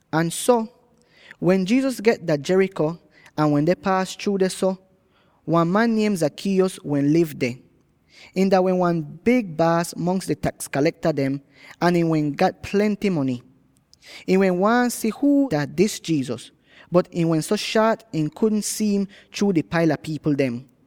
Ahn so, wen Jesus get dah Jericho ahn wende paas chruu dehso, wan man niem Zacchaeus wehn liv deh. Ihn dah wehn wan big baas mongs di taks kalekta dem, ahn ihn wehn gat plenty mony. Ihn wehn waahn si huu dah dis Jesus, bot ihn wehn so shaat ihn kudn si'im chruu di paila pipl dem.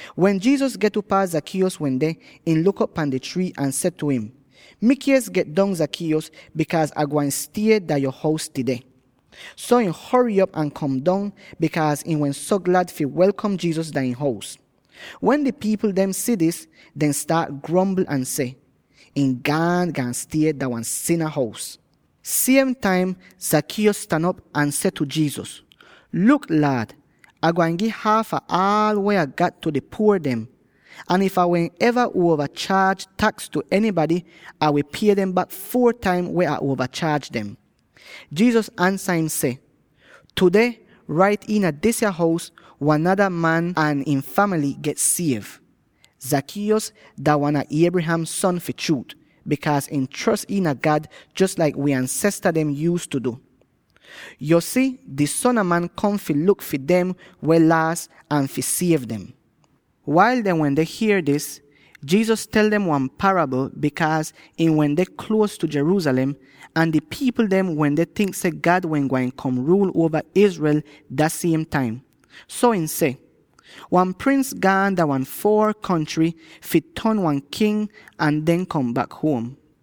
Wen Jesus get upaa Zacchaeus wende, ihn luk op pan di trii ahn seh tu im, “Mikies, get dong Zacchaeus, bikaaz Ah gwain stie dah yo hous tudeh!” So ihn hory op ahn kom dong, bikaaz ihn wehn so glad fi welkom Jesus dah ihn hous. Wen di pipl dem si dis, dehn staat grombl ahn seh, “Ihn gaan, gaan stie dah wan sina hous.” Siem taim Zacchaeus stan op ahn seh tu Jesus, “Luk, Laad! Ah gwain gi haaf ah aal weh Ah gat tu di puor dem, ahn if Ah wehn eva uova chaaj taks tu enybady, Ah wi pie dem bak four taim weh Ah uova chaaj dem.” Jesus ansa im seh, “Tudeh rait yah iina disa hous wan nada man ahn ihn famaly get siev. Zacchaeus dah wan a Abraham son fi chruut, bikaaz ihn chros iina God jos laik wi ansesta dem yuuztu du. Yo si, di Son a Man kom fi luk fi dem weh laas ahn fi siev dem.” Wail dehn wende hier dis, Jesus tel dem wan parabl, bikaaz ihn wehn deh nier tu Jerusalem ahn di pipl dem wende tink seh God wehn gwain kom fi ruul uova Israel dah siem taim. So ihn seh, “Wan prins gaan dah wan foor kontry fi ton wan king ahn den kom bak huom.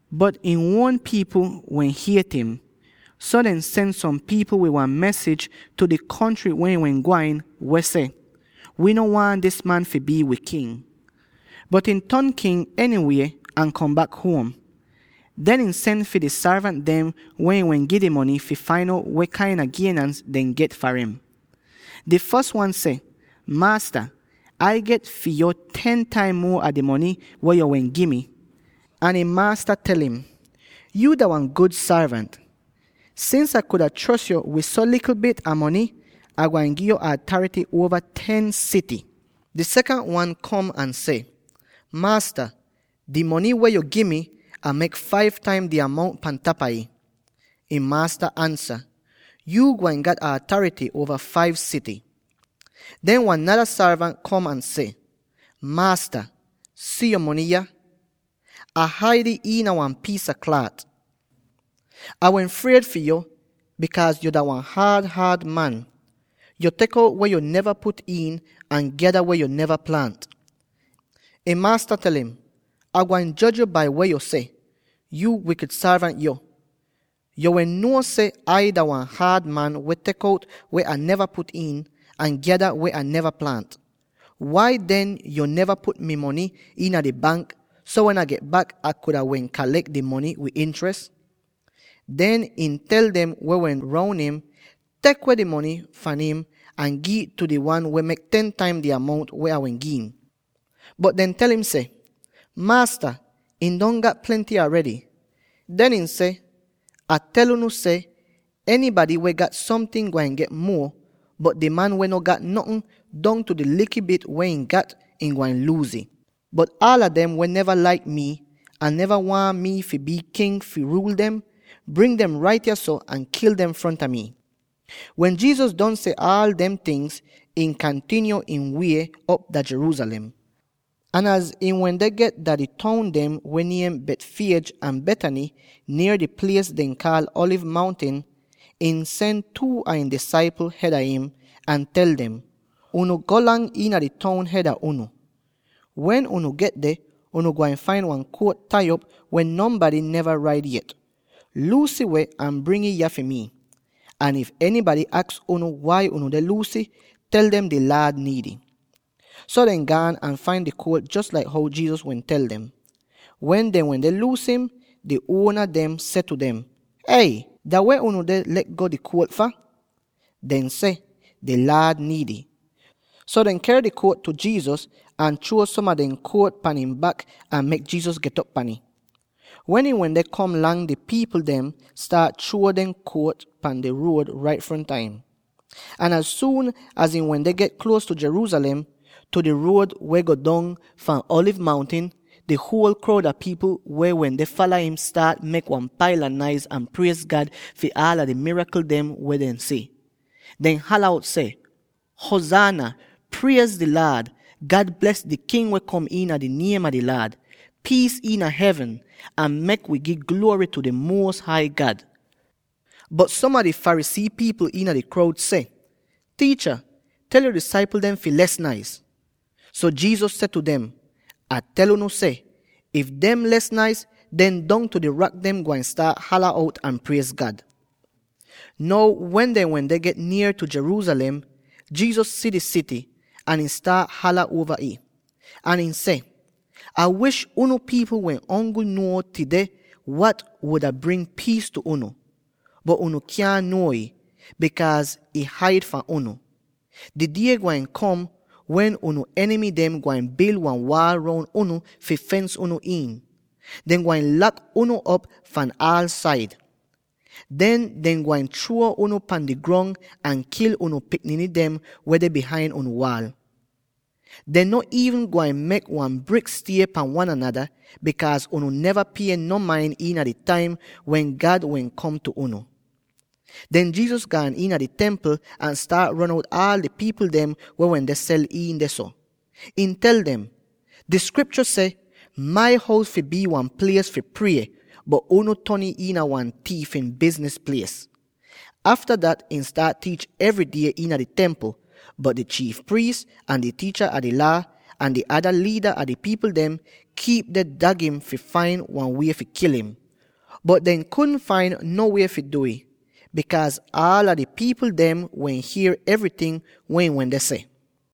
Bot ihn uon pipl wehn hiet im, so dehn sen som pipl wid wan mesij tu di kontry weh ihn wehn gwain, weh seh: ‘Wi no waahn dis man fi bii wi king!’ “Bot ihn ton king enywie ahn kom bak huom. Den ihn sen fi di sorvant dem weh ihn wehn gi di mony, fi fain out weh kain a gienans dehn get far im. Di fos wan seh, ‘Maasta, Ai get fi yo ten taim muo a di mony weh yo wehn gi mi!’ Ahn ihn maasta tel im, ‘Yuu dah wan gud sorvant! Sins Ah kuda chros yo wid so likl bit a mony, Ah gwain gi'yo atarity uova ten sity.’ Di sekant wan kom ahn seh, ‘Maasta, di mony weh yo gi mi, Ah mek five taim di amount pan tapa ih!’ Ihn maasta ansa, ‘Yuu gwain gat atarity uova five sity.’ Den wan nada sorvant kom ahn seh, ‘Maasta, si yo mony yah. Ah haid ih iina wan piis a klaat. Ah wehn fried fi yo, bikaaz yo dah wan haad-haad man. Yo tek out weh yo neva put iin ahn gyada weh yo neva plaant.’ Ihn maasta tel im, ‘Ah gwain joj yo bai weh yo seh, yuu wikid sorvant yo! Yo wehn nuo seh Ai dah wan haad man weh tek outa weh Ah neva put iin, ahn gyada weh Ah neva plaant. Wai den yo neva put mi mony iina di bank, so wen Ah get bak, Ah kuda wehn kalek mi mony wid intres?’ “Den ihn tel dem weh wende roun im, ‘Tek weh di mony fahn im ahn gi'ih tu di wan weh mek ten taim di amount weh Ah wehn gi'im!’ Bot dehn tel im seh, ‘Maasta, ihn don gat plenty aredy.’ Den ihn seh, ‘Ah tel unu seh, enybady weh gat somting gwain get muo, bot di man weh no gat notn, dongtu di likl bit weh ihn gat, ihn gwain luuz ih. Bot aala dem weh neva laik mi, ahn neva waahn mi fi bii king fi ruul dem, bring dem rait yahso ahn kil dem fronta mi.’” Wen Jesus don seh aal dem tingz, ihn kantinyo ihn wie op dah Jerusalem. Ahn az ihn wende get dah di toun dem weh niem Bethphage ahn Bethany, nier di plies dehn kaal Alivz Mountin, ihn sen two a ihn disaipl hed a im, ahn tel dem, “Unu golang iina di toun hed a unu. Wen unu get deh, unu gwain fain wan kuolt tai op, weh nonbady neva raid yet. Luus ih weh ahn bring ih yah fi mi. Ahn if enybady aks unu, ‘Wai unu deh luus ih?’ tel dem di Laad niid ih.” So dehn gaan ahn fain di kuolt jos laik how Jesus wehn tel dem. Wen dehn wende luus im, di uona dem seh tu dem, “Ey! Dah weh unu deh le'go di kuolt fah?” Dehn seh, “Di Laad niid ih.” So dehn ker di kuolt tu Jesus, ahn chruo som a dehn jakit pan ihn bak ahn mek Jesus get'op pahn im. Wen ihn wende kom lang, di pipl dem staat chruo dehn jakit pan di ruod rait fronta im. Ahn az suun az ihn wende get nier tu Jerusalem —tu di ruod weh go dong fahn Alivz Mountin— di huol kroud a pipl weh wende fala im staat mek wan paila naiz ahn priez God fi aal di mirakl dem weh dehn si. Dehn hala out seh: “Huzaana! Priez di Laad! God bles di King weh kom iina di niem a di Laad. Piis iina hevn, ahn mek wi gi gluory tu di Muos Hai God!” Bot som a di Pharisee pipl iina di kroud seh, “Tiicha, tel yo disaipl dem fi les naiz.” So Jesus seh tu dem, “Ah tel unu seh: if dem les naiz, den dongtu di rak dem gwain staat hala out ahn priez God!” Now wen dehn wende get nier tu Jerusalem, Jesus si di sity, ahn ihn staat hala uova ih, ahn ihn seh, “Ah wish unu pipl wehn ongl nuo tudeh wat wuda bring piis tu unu; bot unu kyaahn nuo ih, bikaaz ih haid fahn unu! Di die gwain kom wen unu enimy dem gwain bil wan waal roun unu fi fens unu iin; dehn gwain lak unu op fahn aal said. Den dehn gwain chruo unu pan di grong ahn kil unu pikniny dem weh deh bihain unu waal. Dehn no iivn gwain mek wan brik stie pan wan anada, bikaaz unu neva pie no main iina di taim wen God wehn kom tu unu!” Den Jesus gaan iina di Templ ahn staat ron out aal di pipl dem weh wende sel iin dehso. Ihn tel dem, “Di Skriptyo seh, ‘Mai hous fi bii wan plies fi prie,’ bot unu ton ih iina wan tiifin bizniz plies.” Afta dat ihn staat tiich evry die iina di Templ, bot di chiif priis, ahn di tiicha a di Laa, ahn di ada liida a di pipl dem kiip deh dag im fi fain wan wie fi kil im. Bot dehn kudn fain no wie fi du'ih, bikaaz aala di pipl dem wehn hier evryting weh ihn wende seh.